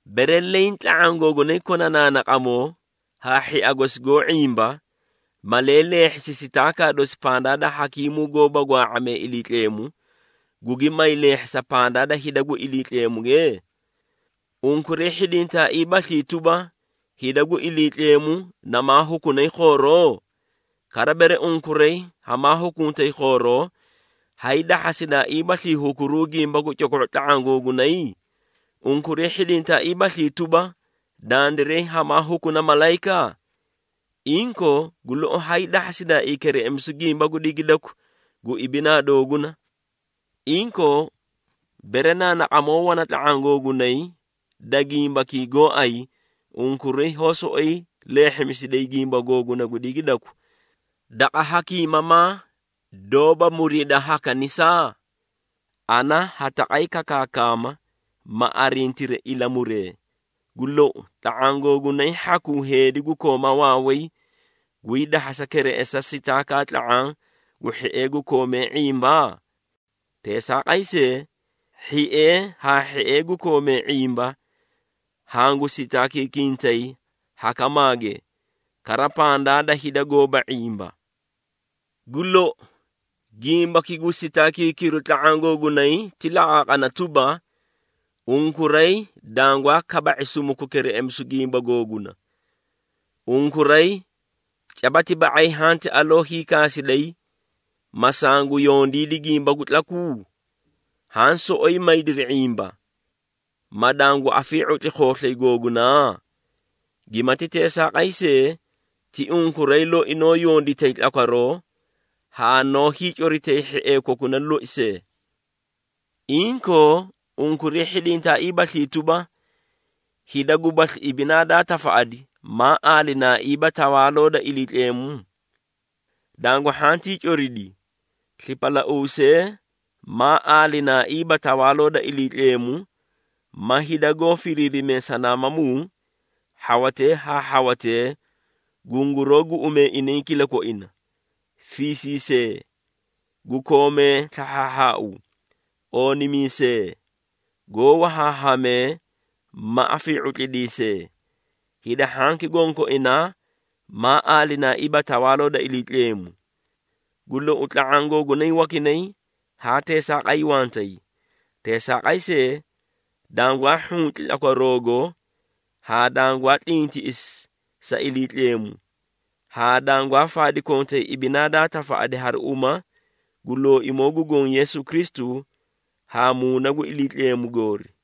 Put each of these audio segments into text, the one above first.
Bere leẽ tla⁄aã googunay kona naanaqamoo haa hhia gosi goó ⁄imba, malee leehhisi sitaakaa dosi pandaa da hakiimuu goóba gwaa⁄amee Iliitleemu, gugi may leehhisa pandaa da hida gu Iliitleemuge? Unkuray hhidintaaiibaslii tuba, hida gu Iliitleemu namaa hukunay khooroo? Kara bere unkuray hamaa hukuntay khooroo, hay dahhasidaaiibaslii hukuruu gimba gu coko⁄o tla⁄aã googunay? Unkuray hhidintaaiibaslii tuba, dandiray hamaa hukuna malayika? Inkoo, gu lou hay dahhasidaaii kereꞌemisu gimba gu digidaku gu ibinaa dooguna! Inkoo, bere naanaqamoo wana tla⁄aã googunay da gimbakii gooay, unkuray hoó soꞌoyi leehhimisiday gimba googuna gu digidaku daqa hakiimamaa doóba muriida ha kanisaa? Ana ha taqay kakaama ma arintiri ilamuree. Gu lou, tla⁄aã googunay hhakuu heedi gu kooma waaway gwii dahhasa kereꞌesa sitaakaa tla⁄aã gu hhiee gu koomee ⁄imba? Teesaaqay see, hhiee haa hhiee gu koomee ⁄imba hangu sitaakiikintay hakamaage, kara pandaa da hida goóba ⁄imba! Gu lou, gimbaki gu sitaakiikiru tla⁄aã googunay ti laqaaqana tuba, unkuray dangwaa kaba⁄i sumuku kereꞌemisu gu gimba googuna. Unkuray caba ti ba⁄ay hanti aloo hiikaasiday, ma sangu yondiidi gimba gu tlaku? Haã soꞌoyi maydiri ⁄imba, ma dangu afii⁄utli khooslay googunaa? Gimati teesaaqay see, ti unkuray loi noó yonditay tlakwaroo haa noó hiicoritay hhiee kokuna loi see! Inkoo, unkuray hhidintaaiibaslii tuba, hida gubasli ibinaa daa tafaꞌadi maa aalinaaiiba Tawaaloo da Iliitleemu? Dangu hhantii coridi! Slipalauusee maa aalinaaiiba Tawaaloo da Iliitleemu ma hida goó firiirimee sanaamamuu, hhawatee haa hhawatee gunguroó guꞌumee inay kilakoina, fiisiisee, gu koomee slahhaahhaau, oonimiisee, goó wahaahamee ma afii⁄utlidiisee, hida hhanki gonkoinaa maa aalinaaiiba Tawaaloo da Iliitleemu. Gu lou, tla⁄aã googunay wakinay haa teesaaqay wantay. Teesaaqay see, dangwaa hhunci tlakwaroogo haa dangwaa tlintiꞌisi sa Iliitleemu, haa dangwaa faadi kontay ibinaa daa tafaꞌadi hari uma gu Looimoo gu Goõ Yeesu Kristu haa Muuna gu Iliitleemu goori.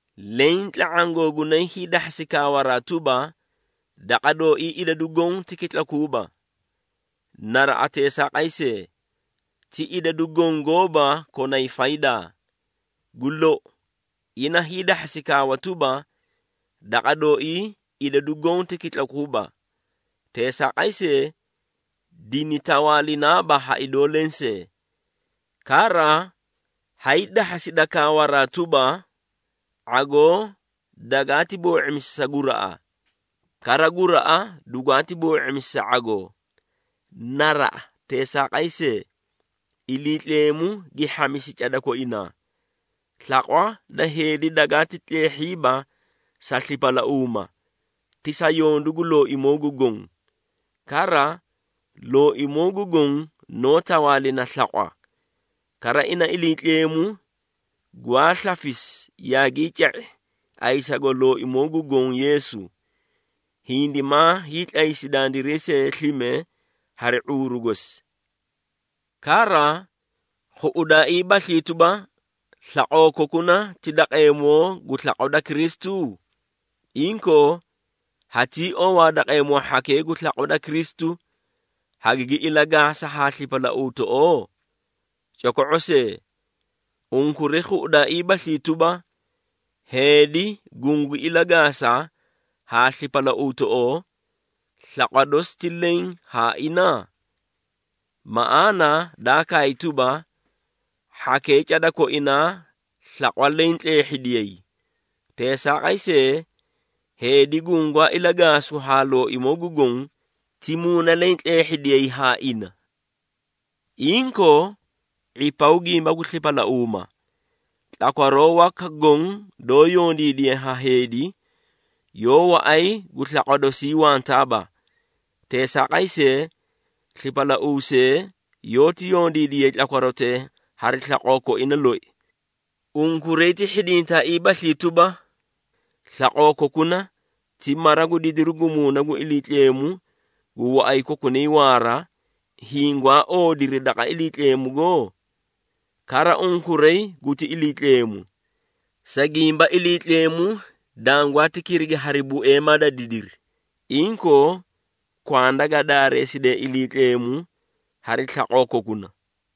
Leẽ tla⁄aã googunay hiidahhasi kaawaraa tuba, “Daqa dooii idadu goõ ti kitlakuuba.” Naraꞌa teesaaqay see, ti idadu goõ gooba konay faydaa. Gu lou, ina hiidahhasi kaawa tuba, “Daqa dooii idadu goõ ti kitlakuuba.” Teesaaqay see, dini tawaalinaaba ha idoo lensee. Kara, hay dahhasida kaawaraa tuba, “⁄agoo dagaati boo⁄imisi sa guraꞌa, kara guraꞌa dugwaati boo⁄imisi sa ⁄agoo.” Naraꞌa teesaaqay see, Iliitleemu gi hhamisi cada koinaa. Slaqwa da heedi dagaati tleehhiiba sa slipalauuma, ti sa yondu gu Looimoo gu Goõ. Kara, Looimoo gu Goõ noó tawaalina slaqwa. Kara ina Iliitleemu gwaa slafisi yaagii ca⁄i ayisago Looimoo gu Goõ Yeesu, hindimaa hiitlaysi dandiray see slime hari ⁄uuru gosi. Kara, khuꞌudaaiibaslii tuba, slaqoo kokuna ti daqeemoo gu slaqwa da Kristu? Inkoo, hatii owaa daqeemoo hhakee gu slaqwa da Kristu, hagigi ilagaasa haa slipalauutoꞌoo? Coko⁄o see! Unkuray khuꞌudaaiibaslii tuba, heedi gungu ilagaasa haa slipalauutoꞌoo, slaqwa dosi ti leẽ haa ina? Maꞌaana daa kaay tuba, “Hhakee cada koinaa slaqwa leẽ tleehhidiyay.” Teesaaqay see, heedi gungaa ilagaasu haa Looimoo gu Goõ, ti muuna leẽ tleehhidiyay haa ina. Inkoo, ⁄ipaw gimba gu slipalauuma. Tlakwaroo waka goõ doó yondiidiye ha heedi, yoó waꞌay gu slaqwa dosii wantaaba. Teesaaqay see, slipalauusee yoóti yondiidiyay tlakwarotee hari slaqoo koina loi. Unkuray ti hhidintaaiibaslii tuba, slaqoo kokuna ti mara gu didiru gu Muuna gu Iliitleemu gu waꞌay kokunay waara, hiĩ gwaa oodiri daqa Iliitleemugo? Kara unkuray guti Iliitleemu. Sa gimba Iliitleemu dangwaati kirigi hari bueema da didiri. Inkoo, kwanda ga daareesidee Iliitleemu hari slaqoo kokuna.